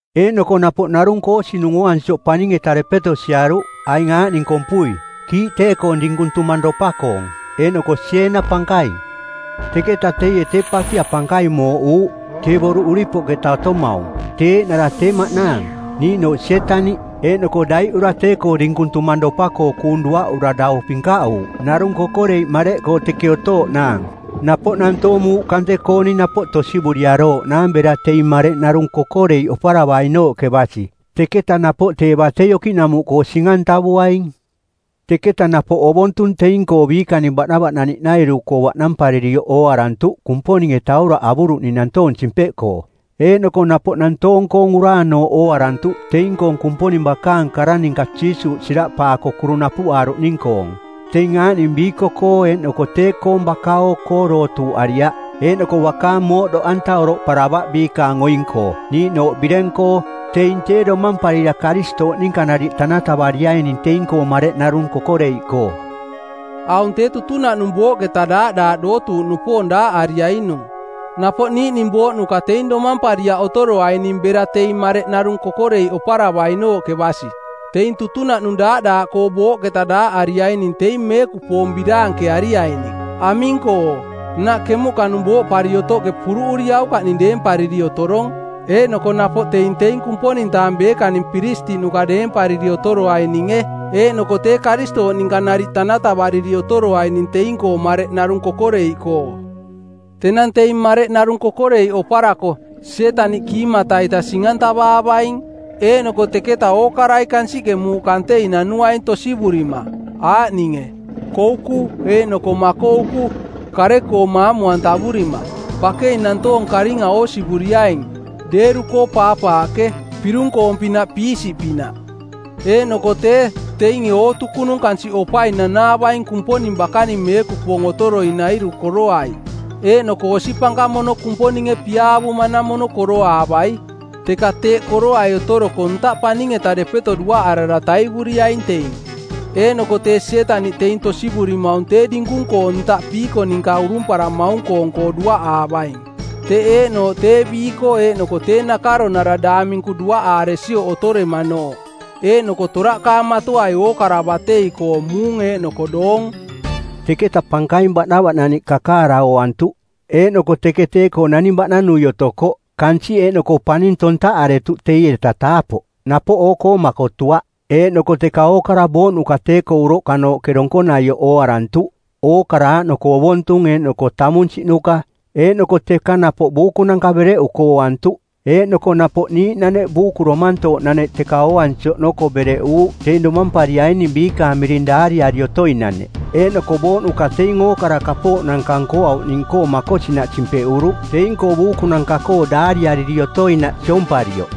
Eeꞌnoko napoꞌ narung koosinung ooansioꞌ paning-eta depeto siaruꞌ, aing aaꞌning kompui: kiiꞌ tee-koong dinkung tumangropa-koong, eeꞌnoko sieena pankaing. Teketa teie tee pakia pankaing mooꞌuuꞌ, tee boruꞌ uripoꞌketa otomaung, tee eeꞌnara tee maꞌnaang, niiꞌnooꞌ Sietaniꞌ. Eeꞌnoko daiꞌura tee-koo dinkung tumangropa-koo kuung duaꞌura dau pinkaꞌuuꞌ narung kokoreiꞌ mareꞌkoo teke otooꞌnaang, napoꞌ nantoong muuꞌ kante-kooning napoꞌ tosivuriarooꞌnaang bera teing mareꞌ narung kokoreiꞌ oparavainooꞌke basi. Teketa napoꞌ tee batei okiꞌnamuꞌkoo sing-antavuaing. Teketa napoꞌ ovontung teing-koo biikaning baꞌnavaꞌnaniꞌnairu-koo baꞌnamparirioꞌ ooarantuꞌ Kumponinge tauraꞌ avuruꞌning nantoong simpeꞌkoo. Eeꞌnoko napoꞌ nantoong-koong uraanooꞌ ooarantuꞌ teing-koong Kumponing bakaang kara ninka Jiisuuꞌ siraꞌpaako kuru napuꞌaaruꞌning-koong. Teing aaꞌning biiko-koo eeꞌnoko tee-koong baka-oo-koo dootuuꞌariaꞌ eeꞌnoko bakaang mooꞌdoꞌanta oroꞌparavaꞌ biikaang oing-koo niiꞌnooꞌ bireng-koo. Teing tee domamparira Karistooꞌ ninka nariꞌ tanatavariaining teing-koo mareꞌ narung kokoreiꞌkoo. Aung tee tutunaꞌnung booꞌketa daaꞌdaaꞌ dootuuꞌnupoong daaꞌariainung. Napoꞌ niiꞌning booꞌnuka teing domampariaꞌ otoroaining bera teing mareꞌ narung kokoreiꞌ oparavainooꞌke basi. Teing tutunaꞌnung daaꞌdaaꞌkoo booꞌketa daaꞌariaining teing meekupoong biraankeariaining. Aming-koo? Nnaꞌ kemuꞌkanung booꞌpari otoꞌke puruꞌuriaukaꞌning deempariri otorong, eeꞌnoko napoꞌ teing teing Kumponing-taang beekaning piristiꞌnuka deempariri otoroaininge, eeꞌnoko tee Karistooꞌ ninka nariꞌ tanatavariri otoroaining teing-koo mareꞌ narung kokoreiꞌkoo. Tenang teing mareꞌ narung kokoreiꞌ oparako, Sietaniꞌ kiimata-ita sing-antavaavaing. Eeꞌnoko teketa ookarai kansiꞌke muuꞌ kantei nanuaing tosivurima, aaꞌninge: Kouku eeꞌnoko Makouku, kare-koo maamu-antavurima. Bakei nantoong karinga oosivuriaing, deeru-koo paapaaꞌke, pirung-koong-pinaꞌ piisiꞌpinaꞌ. Eeꞌnoko tee, teinge ootukunung kansiꞌ opai nanaavaing Kumponing bakaning meekupoong otoroainairu koroai, eeꞌnoko osi pankamono Kumponinge piaavumanamono koroaavai. Teka teeꞌ koroai otoroko ntaꞌke paning-eta depeto duaꞌarara taivuriaing teing. Eeꞌnoko tee Sietaniꞌ teing tosivurimaung tee dinkung-koo ntaꞌ piiko ninka urumparamaung-koong-koo duaꞌaavaing, teꞌ eeꞌnooꞌ tee biiko eeꞌnoko tee nakaronara daang minku duaꞌaaresioꞌ otoremanooꞌ. Eeꞌnoko toraꞌkaamatoai ookara batei-koo muung eeꞌnoko doong. Teketa pankaing baꞌnavaꞌnaniꞌ kakaara ooantuꞌ, eeꞌnoko teke tee-koo tee naning baꞌnanui otokoꞌ. Kansiꞌ eeꞌnoko paning tontaꞌaretuꞌ teieta taapoꞌ, napoꞌ oo-koo makotuaꞌ. Eeꞌnoko teka ookara booꞌnuka tee-koo uroꞌkanooꞌke donkonaioꞌ ooarantuꞌ, ookara aaꞌnoko ovontung eeꞌnoko tamunsiꞌnuka, eeꞌnoko teka napoꞌ buukunanka bereꞌuko ooantuꞌ. Eeꞌnoko napoꞌ niiꞌnaneꞌ buuku domantooꞌnaneꞌ teka ooansi oꞌnoko bereꞌuuꞌ teing domampariaining biikaang miring daariari otoinaneꞌ. Eeꞌnoko booꞌnuka teing ookara kapooꞌnanka nkoauꞌning-koo makosinaꞌ simpeꞌuruꞌ teing-koo buukunanka-koo daariariri otoinaꞌ siomparioꞌ.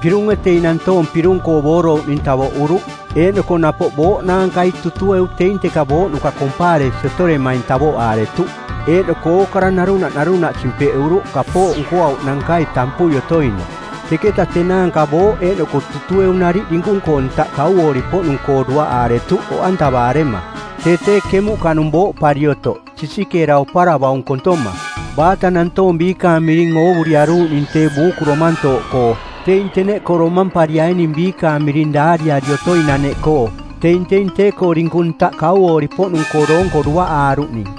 Pirunge teing nantoong pirung-koo boorouꞌning tavoꞌuruꞌ, eeꞌnoko napoꞌ Booꞌ naankai Tutueu teing teka booꞌnuka kompaaresi otoremaing tavoꞌaaretuꞌ, eeꞌnoko ookara narunaꞌ narunaꞌ simpeꞌuruꞌ kapooꞌ nkoauꞌnankai tampui otoinaꞌ. Teketa tenaanka Booꞌ eeꞌnoko Tutueu nariꞌ dinkung-koo ntaꞌ kauoori-poꞌnung-koo duaꞌaaretuꞌ oꞌantavaarema, tee tee kemuꞌkanung booꞌpari otoꞌ, sisikeera oparavaung kontoma. Baata nantoong biikaang miring oovuriaruuꞌning tee buuku domantooꞌkoo teing teneꞌkoo domampariaining biikaang miring daariari otoinaneꞌkoo teing teing tee-koo dinkung ntaꞌ kauoori-poꞌnung-koo doonko duaꞌaaruꞌning.